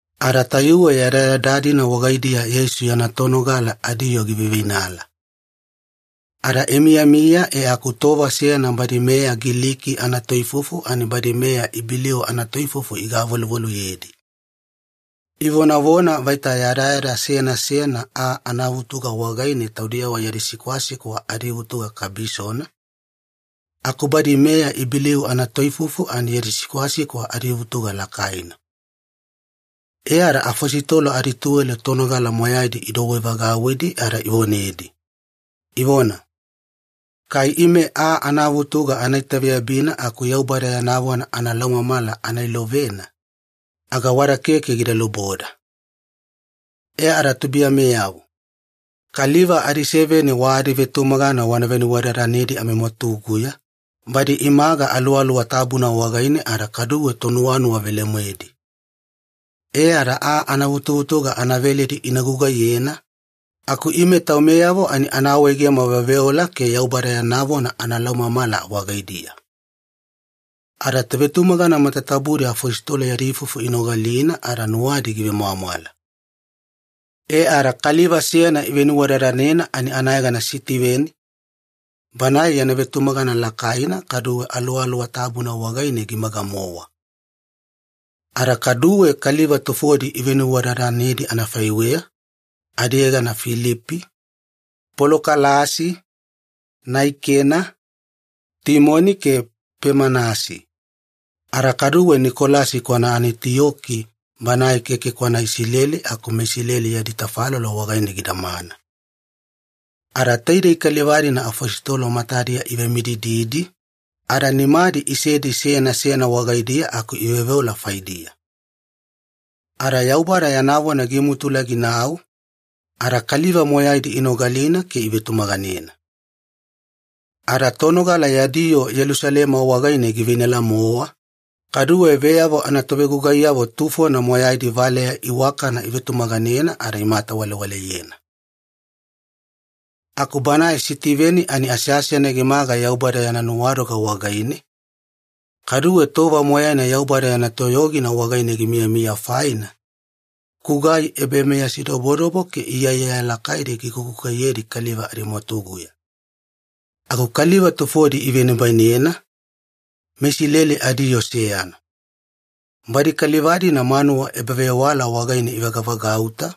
Ada tayuwe yadayada-dina wagaidiya Yeisu yana tonogala adiyoo giveiveinala. Ada imiyamiya e aku tova seyana badi meya Giliki anatoifufu ani badi meya Ibeliu anatoifufu igavoluvoluyedi. Ivonavona vaita yadayada seyana seyana aa anavutuga wagaine taudiyavo yadi sikwasikwa adivutuga kabisona, aku badi meya Ibeliu anatoifufu ani yadi sikwasikwa adivutuga lakaina. E ada afositolo adituwelo tonogala moyaidi idouwevagauwidi ada ivonedi, ivona, “Kai ime aa anavutuga ana itaveyabina aku Yaubada yana vona analaumamala ana ilovena, aga wada keke gida luboda. E ada tubuiyameyavo, kaliva adiseveni wa adivetumagana wana venuwadadanedi amimwatuguya, badi imaga Aluwaluwa Tabuna wagaine ada kaduwe tonuwanuwa velemoedi. E ada aa anavutuvutuga ana veledi ina gugaiyena, aku ime taumeyavo ani ana awaegema veoveola ke Yaubada yana vona analaumamala wagaidiya.” Ada tovetumagana matatabudi afositolo yadi ifufu inogalina ada nuwadi givemwamwala. E ada kaliva seyana ivenuwadadanena ani anayegana Sitiveni, banae yana vetumagana lakaina kaduwe Aluwaluwa Tabuna wagaine gimaga-mowa. Ada kaduwe kaliva tufodi ivenuwadadanedi anafaiweya, adiyegana Filipi, Polokalasi, Naikena, Timoni ke Pamenasi, ada kaduwe Nikolasi kwana Anitiyoki banae keke kwana Isileli aku meIsileli yadi tafalolo wagaine gidamana. Ada taidei kaliva-dina afositolo matadiya ivemidididi, ada nimadi isedi seyana seyana wagaidiya aku iveoveola faidiya. Ada Yaubada yana vona gimutula ginau, ada kaliva moyaidi inogalina ke ivetumaganena. Ada tonogala yadi yoo Yelusalema wagaine giveinala-mowa, kaduwe veyavo anatovegugaiyavo tufona moyaidi valeya iwakana ivetumaganena ada imatawalewaleyena. Aku banae Sitiveni ani aseasena gimaga Yaubada yana nuwadoga wagaine, kaduwe tova moyaina Yaubada yana toyogina wagaine gimiyamiya faina, gugai ebameyasidobodobo ke iyaiyaya lakaidi gigugugaiyedi kaliva adimwatuguya. Aku kaliva tufodi ivenibainena, meIsileli adiyoo seyana. Badi kaliva-dina manuwa ebavewala wagaine ivagavagauta,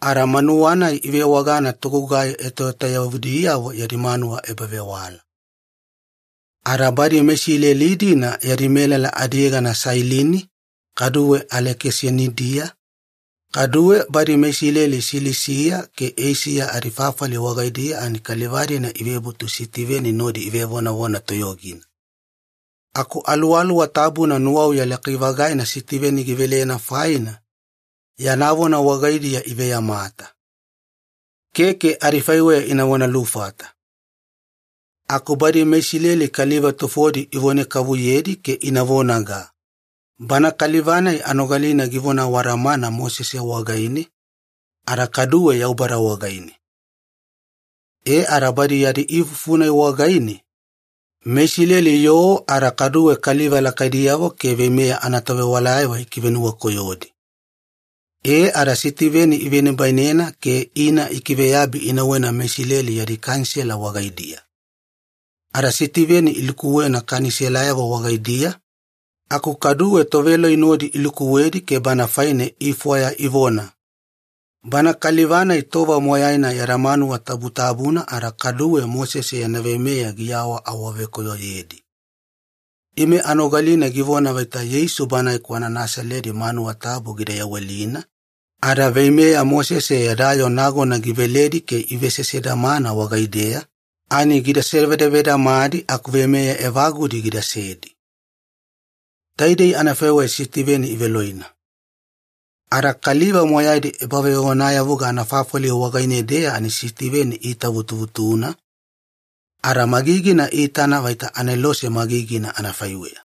ada manuwa-nai ivewagana Togugai Etoetoyavugidiyavo Yadi Manuwa Ebavewala. Ada badi meIsileli-dina yadi melala adiyegana Sailini kaduwe Alekisanidia, kaduwe badi meIsileli Silisiya ke Eisiya adifafali wagaidiya ani kaliva-dina ivebutu Sitiveni nodi ivevonavona toyogina. Aku Aluwaluwa Tabuna nuwauya lakai-vagaina Sitiveni givelena faina, yana vona wagaidiya iveyamata. Keke adifaiweya ina vonalufata. Aku badi meIsileli kaliva tufodi ivonekavuyedi ke ina vonaga, “Bana kaliva-nai anogalina givona awadamana Mosese wagaine, ada kaduwe Yaubada wagaine.” E ada badi yadi ifufu-nai wagaine, meIsileli yoo ada kaduwe kaliva lakaidiyavo ke veimeya anatovewalayavo ikivenuwakoyodi. E ada Sitiveni ivenibainena ke ina ikiveyabi inauwena meIsileli yadi Kanisela wagaidiya. Ada Sitiveni ilukuwena Kaniselayavo wagaidiya, aku kaduwe toveloi nodi ilukuwedi ke bana faine ifwaya ivona, “Bana kaliva-nai tova moyaina yada manuwa tabutabuna ada kaduwe Mosese yana veimeya giawaawavekoyoyedi. Ime anogalina givona vaita Yeisu Banae kwana Nasaledi manuwa tabu gida yawelina, ada veimeya Mosese yada yoo nagona giveledi ke ivesesevedamana wagaideya, ani gida sevedavedamadi aku veimeya evagudi gidasedi.” Taidei anafaiweya Sitiveni iveloina. Ada kaliva moyaidi ebavevonayavuga anafafali wagaine-deya ani Sitiveni iitavutuvutuna, ada magigina iitana vaita anelose magigina anafaiweya.